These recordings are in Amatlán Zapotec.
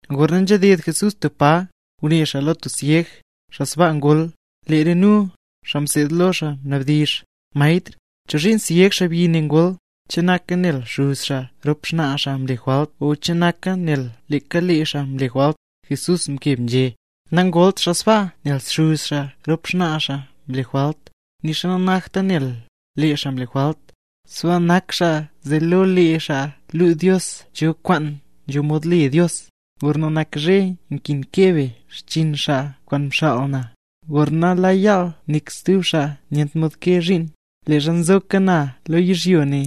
Gorna nzhaded Jesús tub pa, ngune xaa lo tub syeg, xaa sbaa ngol. Lee re nu, xaa mseed lo xaa mnabdizh: —Maestr, ¿chozhiin syeg xaabyi ne ngol? ¿Che naka nel xuz xaa rop xnaa xaa mle jwalt o che naka nel leeka lee xaa mle jwalt? Jesús mkeb né: —Nangolt xaa sbaa nel xuz xaa rop xnaa xaa mle jwalt, nixa nanakta nel lee xaa mle jwalt; sbaa nak xaa, zee lo lee xaa luu Dios cho kwaan nzho mod le Dios. Gorna nak zhe nkin kee be xchiin xaa kwaan mxaal na; gorna la yaal nik stub xaa nyent mod kee zhiin. Leezha nzoka na lo yizhyo ne,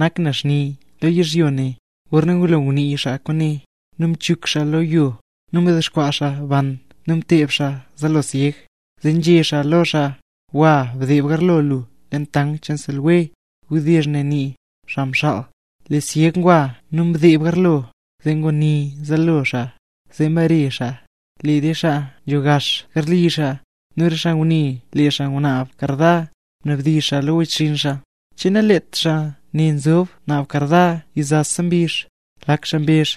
nak na xni lo yizhyo ne. Gorna ngulo ngunii xaa kwaane, nu mchuk xaa lo yo, nu mdexkwaa xaa ban nu mteeb xaaya zaalo syeg. Zee nzhé xaa lo xaa: —Gwa, bdeeb garlo lu leen tank kwaan le Siloé. (Wdizh ne nii: “Xaa mxaal”.) Lee syeg ngwa nu mdeeb garlo, zee nguni zaalo xaa, zee mbare xaa. Lee re xaa nzho gax garli xaa, nu re xaa ngune lee xaa ngunaab karda, mnabdizh xaa lo wechxinn xaa: —¿Che nalet xaa ne nzob naab karda yizasa mbizh? Lak xaa mbezh: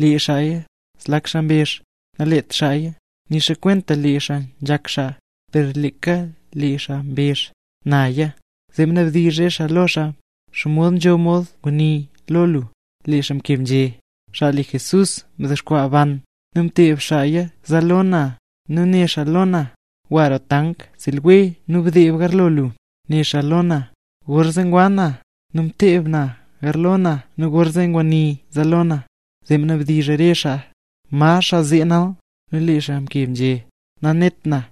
—Lee xaaya. Zlak xaa mbezh: —Nalet xaaya, nixa kwenta lee xaa nzhak xaa. Per leeka lee xaa mbezh: —Naya. Zee mnabdizh re xaa lo xaa: —¿Xomod nzho ngwii lo lu? Lee xaa mkeb nzhé: —Xaa le Jesús mdexkwaa ban, nu mteeb xaaya zaalo na, nu né xaa lo na: “Gwa roo Tank Siloé nu bdeeb garlo lu”, né xaa lo na. Gorzee ngwa na, nu mteeb na garlo na nu gorzee nguni zaalo na. Zee mnabdizh re xaa: —¿Ma xaa zee nal? Nu lee xaa mkeb nzhé: —Nanet na.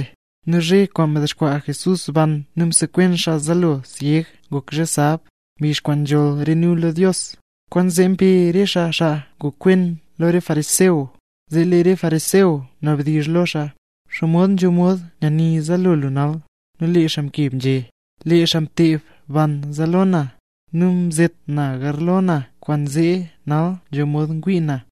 Nu zhe kwaan mdexkwaa Jesús ban nu msekwen xaa zaalo syeg ngok zhe sab, mbizh kwaan nzholl re nu lo Dios. Kwaanzee mbe re xaa xaa ngokwen lo re fariseo. Zee lee re fariseo mnabdizh lo xaa: —¿Xomod nzho mod nyani zaalo lu nal? Nu lee xaa mkeb nzhé: —Lee xaa mteeb ban zaalo na, nu mzet na garlo na kwaanzee nal nzho mod ngwii na.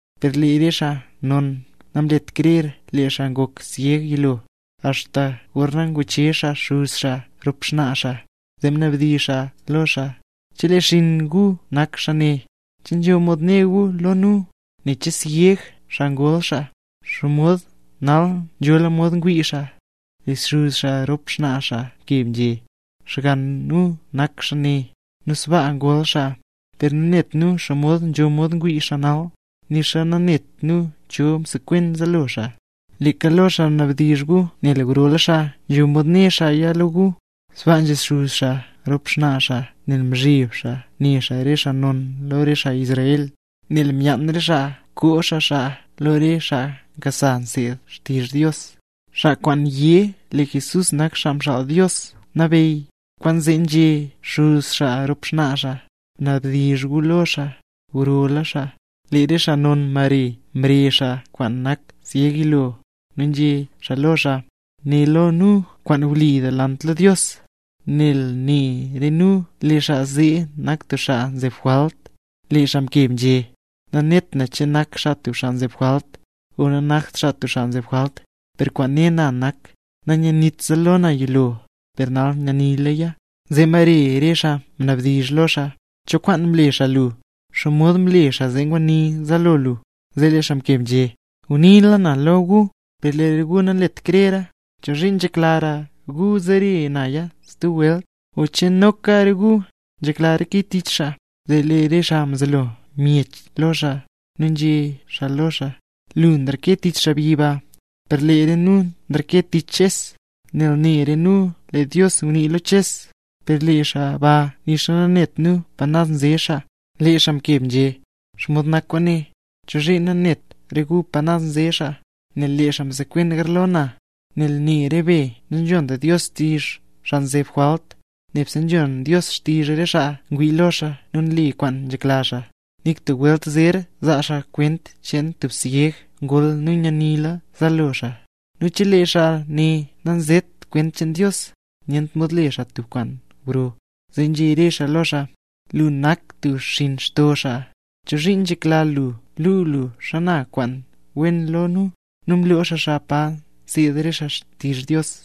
Per lee re xaa non namlet krer lee xaa ngok syeg yilo, axta gorna nguchezh xaa xuz xaa rop xnaa xaa, zee mnabdizh xaa lo xaa: —¿Chelee xinn gu nak xaa ne? ¿Che nzho mod né gu lo nu, nen che syeg xaa ngol xaa? ¿Xomod nal, nzhola mod ngwii xaa? Lee xuz xaa rop xnaa xaa mkeb nzhé: —Xgann nu nak xaa ne, nu sbaa ngol xaa; per nanet nu xomod nzho mod ngwii xaa nal, nixa nanet nu cho msekwen zaalo xaa. Leeka lo xaa bnabdizh gu nel grola xaa, nzho mod né xaaya lo gu. Sbaa nzhé xuz xaa rop xnaa xaa nel nzheb xaa ne xaa re xaa non lo re xaa Israel, nel myaan re xaa koo xaa xaa lo re xaa nkasa nseed xtizh Dios, xaa kwaan yé lee Jesús nak Xaa Mxaal Dios Nabeyy. Kwaanzee nzhé xuz xaa rop xnaa xaa: “Bnabdizh gu lo xaa, grola xaa”. Lee re xaa non mbare mrezh xaa kwaan nak syeg yilo, nu nzhé xaa lo xaa: —Né lo nu kwaan wli delant lo Dios. Nel ne re nu lee xaa zee nak tub xaa nzeb jwalt. Lee xaa mkeb nzhé: —Nanet na che nak xaa tub xaa nzeb jwalt, o nanakt xaa tub xaa nzeb jwalt. Per kwaan ne na nak, nanyanit zaalo na yilo, per nal nyanilaya. Zee mbare re xaa ngunabdizh lo xaa: —¿Cho kwaan mle xaa lu? ¿Xomod mle xaa zee nguni zaalo lu nal? Lee xaa mkeb nzhé: —Nguniila naya lo gu, per lee gu nanlet krera. ¿Chozhiin nzheklara gu zere naya stub welt? ¿O che noka re gu nzhekla reke tich xaa? Zee lee re xaa mzelo myech lo xaa, nu nzhé xaa lo xaa: —Lu nreke tich xaabyi ba, per lee re nu nreke tich Ches, nel ne re nu lee Dios ngunii lo Ches; per lee xaa ba nixa nanet nu pa naz nze xaa. Lee xaa mkeb nzhé: —¿Xomod nak kwaane? ¿Chozhiin nanet re gu pa naz nze xaa, nel lee xaa msekwen garlo na? Nel ne re be nanzhont Dios xtizh xaa kwaan nzeb jwalt; nebse nzhon Dios xtizh re xaa kwaan ngwii lo xaa nu nle kwaan nzhekla xaa. Nik tub welt zer zaa xaa kwent cheen tub syeg ngol nu nyanila zaalo xaa. Nu chelee xaa ne nanzet kwent cheen Dios, nyent mod le xaa tub kwaan gro. Zee nzhé re xaa lo xaa: —¡Lu nak tub xinn xto xaa! ¿Chozhiin nzhekla lu luu lu xana kwent wen lo nu? Nu mloo xaa xaa pa nseed re xaa xtizh Dios.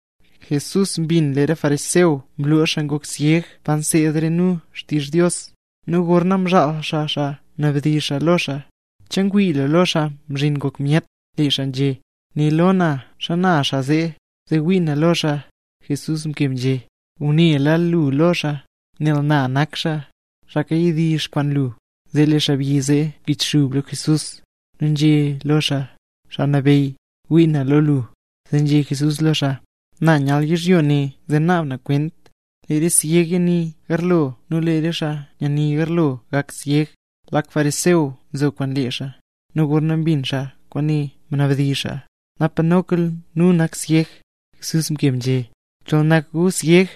Jesús mbin lee re fariseo mloo xaa ngok syeg pa nseed re nu xtizh Dios; nu gorna mzhaal xaa xaa mnabdizh xaa lo xaa: —¿Che ngwii lu lo Xaa Mzhin Ngok Myet? Lee xaa nzhé: —Né lo na, xana xaa zee, zee wii na lo xaa. Jesús mkeb nzhé: —Ngunela lu lo xaa, nel na nak xaa, xaa kawdizh kwaan lu. Zee lee xaabyi zee mkichxub lo Jesús, nu nzhé lo xaa: —Xaa Nabeyy, ngwii na lo lu. Zee nzhé Jesús lo xaa: —Na nyal yizhyo ne zee naab na kwent; lee re syeg yani garlo nu lee re xaa nyani garlo gak syeg. Lak fariseo nzo kwaan lee xaa, nu gorna mbin xaa kwaane mnabdizh xaa: —¿Napa noka nu nak syeg? Jesús mkeb nzhé: —Chol nak gu syeg,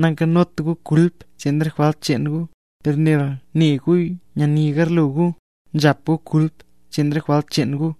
nankanot gu kulp cheen re jwalt cheen gu. Per nel né gu nyani garlo gu, nzhap gu kulp cheen re jwalt cheen gu.